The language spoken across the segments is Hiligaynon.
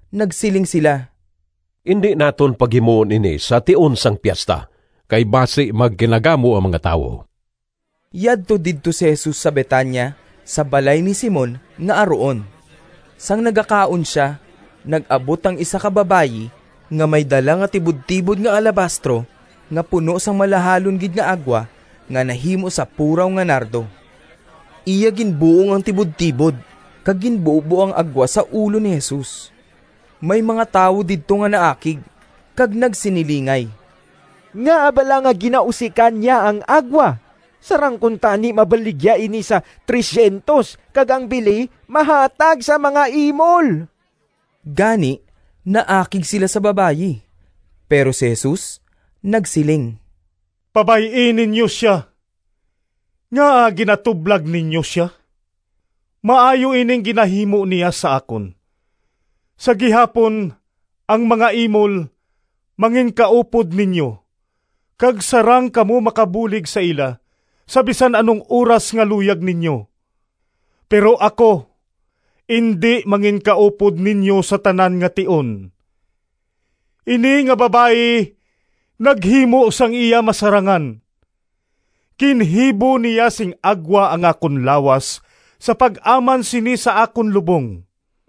Nagsiling sila, “Indi naton paghimuon ini sa tion sang piesta, kay basi magkinagamo ang mga tawo.” Yadto didto si Jesus sa Betania sa balay ni Simon nga aruon. Sang nagakaon sia, nag-abot ang isa ka babayi nga may dala nga tibudtibod nga alabastro nga puno sang malahalon gid nga agwa nga nahimo sa puraw nga nardo. Iya ginbuong ang tibudtibod kag ginbubo ang agwa sa ulo ni Jesus. May mga tawo didto nga naakig kag nagsinilingay, “Ngaa bala nga ginausikan niya ang agwa? Sarang kuntani mabaligya ini sa P300 kag ang bili mahatag sa mga imol!” Gani naakig sila sa babayi. Pero si Jesus nagsiling, “Pabay-i ninyo sia. Ngaa ginatublag ninyo sia? Maayo ining ginahimo niya sa akon. Sa gihapon ang mga imol manginkaupod ninyo kag sarang kamo makabulig sa ila sa bisan anong oras nga luyag ninyo, pero ako indi manginkaupod ninyo sa tanan nga tion. Ini nga babayi naghimo sang iya masarangan. Ginhibo niya sing agwa ang akon lawas sa pag-aman sini sa akon lubong.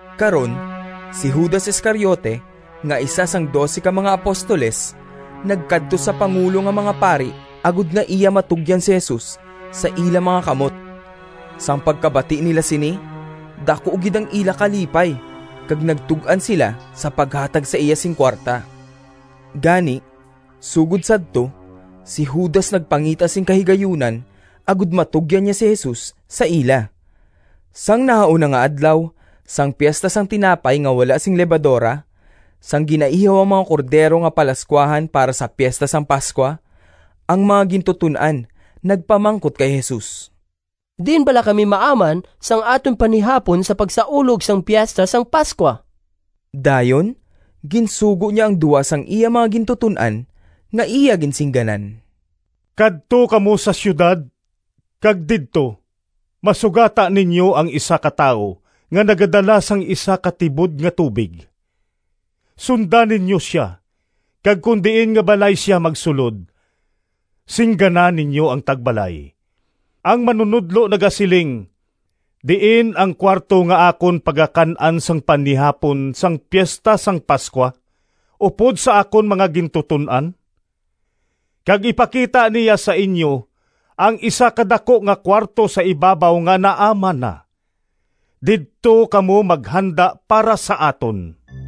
Karon si Judas Iscariote nga isa sang dose ka mga apostoles nagkadto sa pangulo nga mga pari agod nga iya matugyan si Jesus sa ila mga kamot. Sang pagkabati nila sini, daku gid ang ila kalipay kag nagtug-an sila sa paghatag sa iya sing kuwarta. Gani, sugod sadto si Judas nagpangita sing kahigayunan agod matugyan niya si Jesus sa ila. Sang nahauna nga adlaw sang Piesta sang Tinapay nga wala sing Lebadora, sang ginaihaw ang mga cordero nga palascuahan para sa Piesta sang Pascua, ang mga gintuton-an nagpamangkot kay Jesus, “Diin bala kami maaman sang aton panihapon sa pagsaulog sang Piesta sang Pascua?” Dayon ginsugo niya ang duha sang iya mga gintuton-an nga iya ginsingganan, “Kadto kamo sa siyudad kag didto masugata ninyo ang isa ka tawo nga nagadala sang isa ka tibod nga tubig. Sunda ninyo sia kag kon diin nga balay sia magsulod, singgana ninyo ang tagbalay, ‘Ang Manunodlo nagasiling, Diin ang kuwarto nga akon pagakan-an sang panihapon sang Piesta sang Pascua upod sa akon mga gintuton-an?’ Kag ipakita niya sa inyo ang isa ka daku nga kuwarto sa ibabaw nga naaman na. Didto kamo maghanda para sa aton.”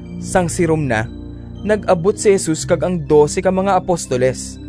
Sang sirom na, nag-abot si Jesus kag ang dose ka mga apostoles.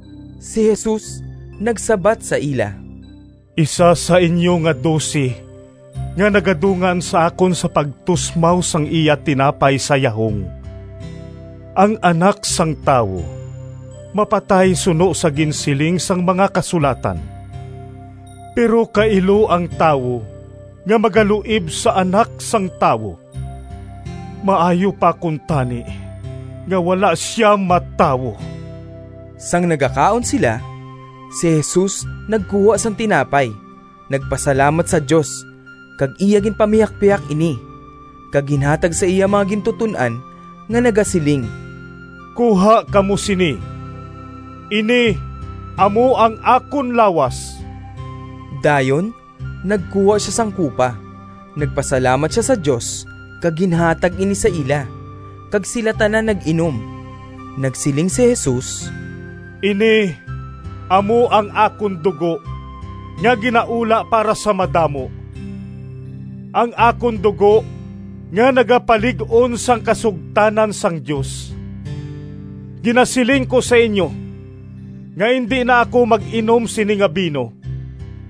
Si Jesus nagsabat sa ila, “Isa sa inyo nga dose nga nagadungan sa akon sa pagtusmaw sang iya tinapay sa yahong. Ang Anak sang Tawo mapatay suno sa ginsiling sang mga Kasulatan, pero kailo ang tawo nga magaluib sa Anak sang Tawo! Maayo pa kuntani nga wala sia matawo!” Sang nagakaon sila, si Jesus nagkuha sang tinapay, nagpasalamat sa Dios, kag iya ginpamihakpihak ini kag ginhatag sa iya mga gintuton-an nga nagasiling, “Kuha kamo sini, ini amo ang akon lawas.” Dayon nagkuha sia sang kupa, nagpasalamat sia sa Dios, kag ginhatag ini sa ila, kag sila tanan nag-inom. Nagsiling si Jesus, “Ini amo ang akon dugo nga ginaula para sa madamo, ang akon dugo nga nagapalig-on sang kasugtanan sang Dios. Ginasiling ko sa inyo nga indi na ako mag-inom sini nga bino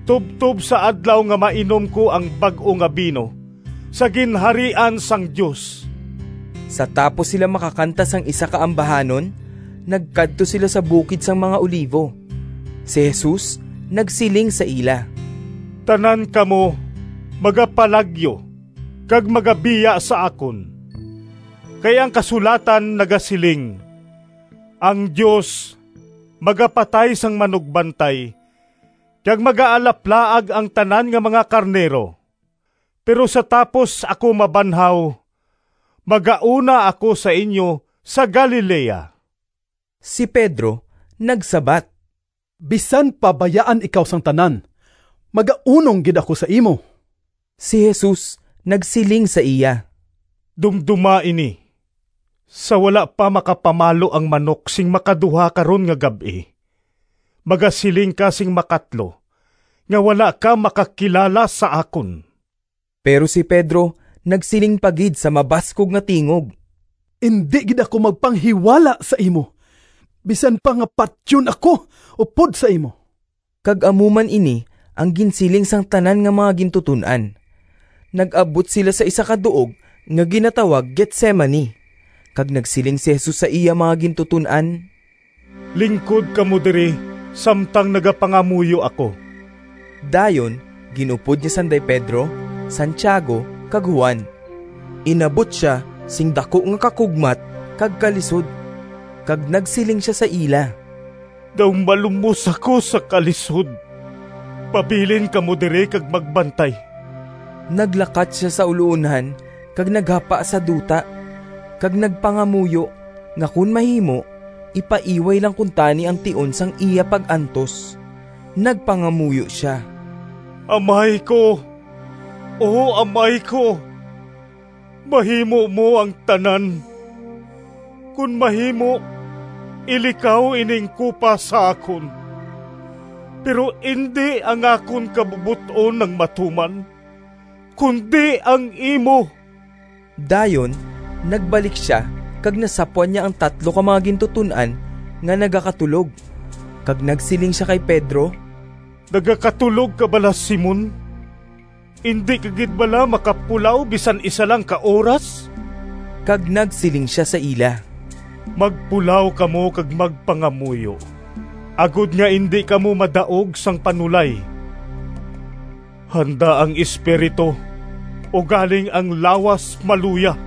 tubtob sa adlaw nga mainom ko ang bag-o nga bino sa Ginharian sang Dios.” Sa tapos sila makakanta sang isa ka ambahanon nagkadto sila sa bukid sang mga Olivo. Si Jesus nagsiling sa ila, “Tanan kamo magapalagyo kag magabiya sa akon kay ang kasulatan nagasiling, ‘Ang Dios magapatay sang manugbantay kag magaalaplaag ang tanan nga mga karnero.’ Pero sa tapos ako mabanhaw, magauna ako sa inyo sa Galilea.” Si Pedro nagsabat, “Bisan pa bayaan ikaw sang tanan magaunong gid ako sa imo.” Si Jesus nagsiling sa iya, “Dumdoma ini! Sa wala pa makapamalo ang manok sing makaduha karon nga gab-i, magasiling ka sing makatlo nga wala ka makakilala sa akon.” Pero si Pedro nagsiling pa gid sa mabaskog nga tingog, “Indi gid ako magpanghiwala sa imo, bisan pa nga patyon ako upod sa imo!” Kag amo man ini ang ginsiling sang tanan nga mga gintuton-an. Nag-abot sila sa isa ka duog nga ginatawag Getsemani, kag nagsiling si Jesus sa iya mga gintuton-an, “Lingkod kamo diri samtang nagapangamuyo ako.” Dayon gin-upod niya sanday Pedro, Santiago, kag Juan. Inabot sia sing daku nga kakugmat kag kalisod, kag nagsiling sia sa ila, “Daw malumos ako sa kalisod. Pabilin kamo diri kag magbantay.” Naglakat sia sa uloonhan kag naghapa sa duta kag nagpangamuyo nga, kon mahimo, ipaiway lang kuntani ang tion sang iya pag-antos. Nagpangamuyo sia, “Amay ko, O Amay ko, mahimo mo ang tanan. Kon mahimo ilikaw ining kupa sa akon. Pero indi ang akon kabubot-on ang matuman kundi ang imo.” Dayon nagbalik sia kag nasapwan niya ang tatlo ka mga gintuton-an nga nagakatulog, kag nagsiling sia kay Pedro, “Nagakatulog ka bala, Simon? Indi ka gid bala makapulaw bisan isa lang ka oras?” Kag nagsiling sia sa ila, “Magpulaw kamo kag magpangamuyo agod nga indi kamo madaog sang panulay. Handa ang espiritu, ugaling ang lawas maluya.”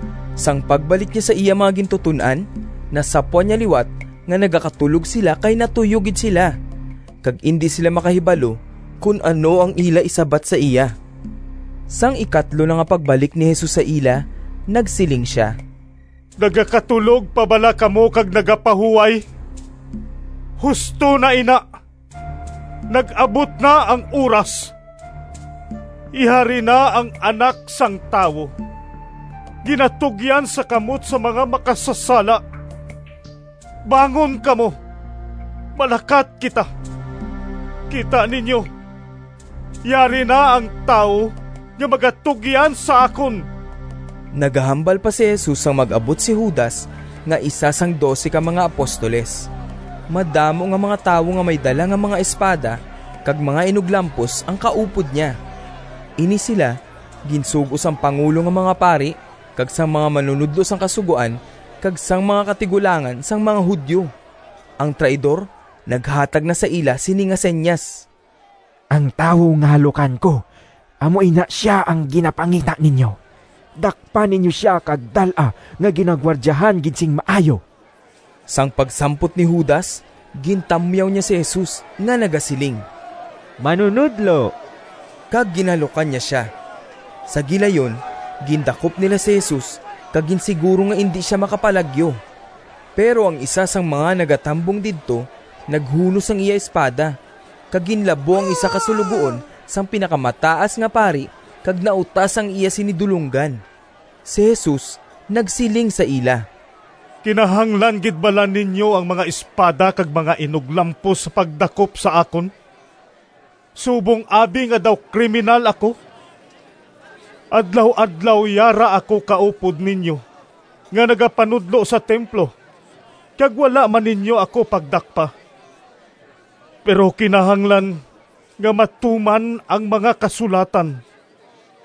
Sang pagbalik niya sa iya mga gintuton-an, nasapwan niya liwat nga nagakatulog sila kay natuyo gid sila, kag indi sila makahibalo kon ano ang ila isabat sa iya. Sang ikatlo na nga pagbalik ni Jesus sa ila, nagsiling sia, “Nagakatulog pa bala kamo kag nagapahuway? Husto na ina! Nag-abot na ang oras! Yari na, ang Anak sang Tawo ginatugyan sa kamot sang mga makasasala. Bangon kamo, malakat kita. Kita ninyo, yari na ang tawo nga magatugyan sa akon!” Nagahambal pa si Jesus sang mag-abot si Judas nga isa sang dose ka mga apostoles. Madamo nga mga tawo nga may dala nga mga espada kag mga inuglampos ang kaupod niya. Ini sila ginsugo sang pangulo nga mga pari kag sang mga manunodlo sang Kasugoan, kag sang mga katigulangan sang mga Judio. Ang traidor naghatag na sa ila sini nga sinyas, “Ang tawo nga halukan ko amo ina sia ang ginapangita ninyo. Dakpa ninyo sia kag dal-a nga ginagwardyahan gid sing maayo.” Sang pagsampot ni Judas, gintamyaw niya si Jesus nga nagasiling, “Manunodlo!” kag ginhalukan niya sia. Sa gilayon gindakop nila si Jesus kag ginsiguro nga indi sia makapalagyo. Pero ang isa sang mga nagatambong didto naghunos sang iya espada kag ginlabo ang isa ka suloguon sang Pinakamataas nga Pari kag nautas ang iya sini du longgan. Si Jesus nagsiling sa ila, “Kinahanglan gid bala ninyo ang mga espada kag mga inuglampos sa pagdakop sa akon, subong abi nga daw kriminal ako? Adlaw-adlaw yara ako kaupod ninyo nga nagapanudlo sa templo kag wala man ninyo ako pagdakpa. Pero kinahanglan nga matuman ang mga Kasulatan.”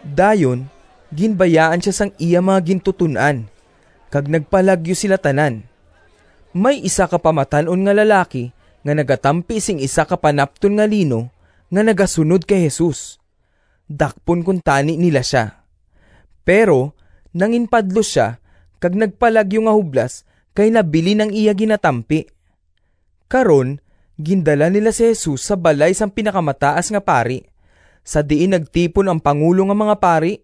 Dayon ginbayaan sia sang iya mga gintuton-an, kag nagpalagyo sila tanan. May isa ka pamatan-on nga lalaki nga nagatampi sing isa ka panapton nga lino nga nagasunod kay Jesus. Dakpon kuntani nila sia, pero nanginpadlos sia kag nagpalagyo nga hublas kay nabilin ang iya ginatampi. Karon gindala nila si Jesus sa balay sang Pinakamataas nga Pari sa diin nagtipon ang pangulo nga mga pari,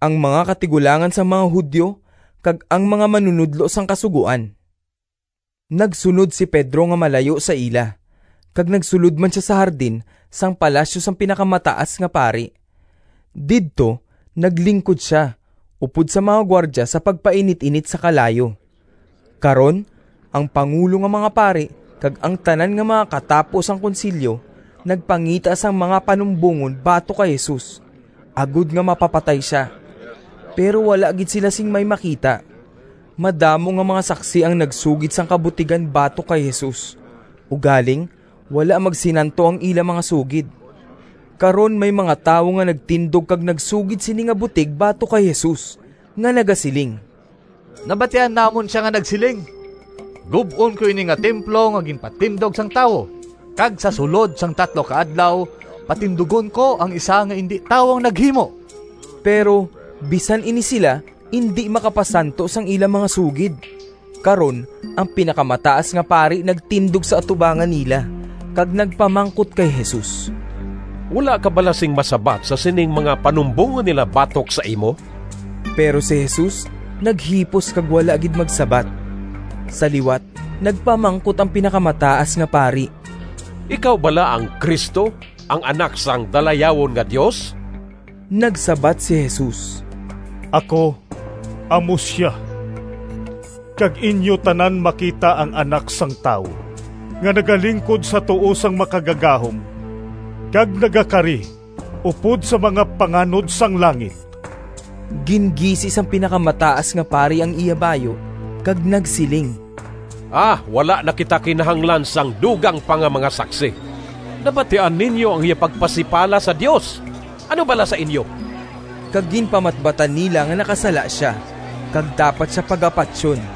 ang mga katigulangan sang mga Judio, kag ang mga manunodlo sang Kasugoan. Nagsunod si Pedro nga malayo sa ila, kag nagsulod man sia sa hardin sang palasyo sang Pinakamataas nga Pari. Didto naglingkod sia upod sa mga gwardya sa pagpainit-init sa kalayo. Karon ang pangulo nga mga pari kag ang tanan nga mga katapo sang Konsilyo nagpangita sang mga panumbongon batok kay Jesus agod nga mapapatay sia, pero wala gid sila sing may makita. Madamo nga mga saksi ang nagsugid sang kabutigan batok kay Jesus ugaling wala magsinanto ang ila mga sugid. Karon may mga tawo nga nagtindog kag nagsugid sini nga butig batok kay Jesus nga nagasiling, “Nabatian namon sia nga nagsiling, ‘Gub-on ko ini nga templo nga ginpatindog sang tawo, kag sa sulod sang tatlo ka adlaw patindugon ko ang isa nga indi tawo ang naghimo.’” Pero bisan ini sila indi makapasanto sang ila mga sugid. Karon ang Pinakamataas nga Pari nagtindog sa atubangan nila kag nagpamangkot kay Jesus, “Wala ka bala sing masabat sa sining mga panumbongon nila batok sa imo?” Pero si Jesus naghipos kag wala gid magsabat. Sa liwat nagpamangkot ang Pinakamataas nga Pari, “Ikaw bala ang Cristo, ang Anak sang Dalayawon nga Dios?” Nagsabat si Jesus, “Ako amo sia, kag inyo tanan makita ang Anak sang Tawo nga nagalingkod sa tuo sang Makagagahom kag nagakari upod sa mga panganod sang langit!” Gingisi sang Pinakamataas nga Pari ang iya bayu kag nagsiling, “Wala na kita kinahanglan sang dugang pa nga mga saksi! Nabatian ninyo ang iya pagpasipala sa Dios. Ano bala sa inyo?” Kag ginpamatbatan nila nga nakasala sia kag dapat sia pagapatyon.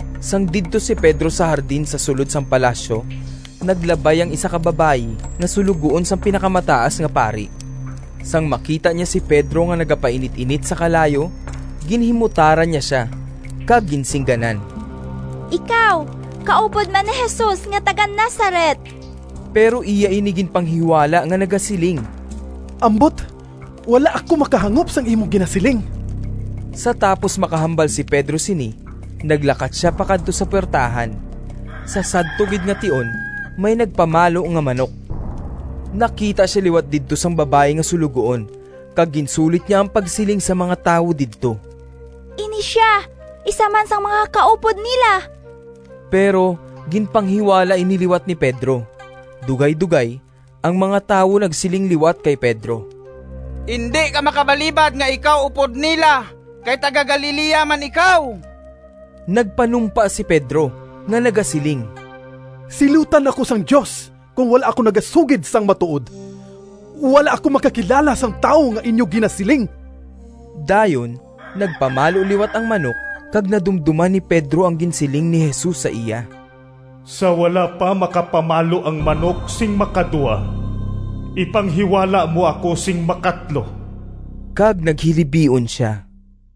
Sang didto si Pedro sa hardin sa sulod sang palasyo, naglabay ang isa ka babayi nga suloguon sang Pinakamataas nga Pari. Sang makita niya si Pedro nga nagapainit-init sa kalayo, ginhimutaran niya sia kag ginsingganan, “Ikaw kaupod man ni Jesus nga taga-Nazaret.” Pero iya ini ginpanghiwala nga nagasiling, “Ambot, wala ako makahangop sang imo ginasiling.” Sa tapos makahambal si Pedro sini naglakat sia pakadto sa puwertahan. Sa sadto gid nga tion may nagpamalo nga manok. Nakita sia liwat didto sang babayi nga suloguon kag ginsulit niya ang pagsiling sa mga tawo didto, “Ini sia isa man sang mga kaupod nila!” Pero ginpanghiwala ini liwat ni Pedro. Dugaydogay ang mga tawo nagsiling liwat kay Pedro, “Indi ka makabalibad nga ikaw upod nila kay taga-Galilea man ikaw.” Nagpanumpa si Pedro nga nagasiling, “Silutan ako sang Dios kon wala ako nagasugid sang matuod! Wala ako makakilala sang tawo nga inyo ginasiling!” Dayon nagpamalo liwat ang manok kag nadumdoman ni Pedro ang ginsiling ni Jesus sa iya, “Sa wala pa makapamalo ang manok sing makaduha, ipanghiwala mo ako sing makatlo.” Kag naghilibion sia.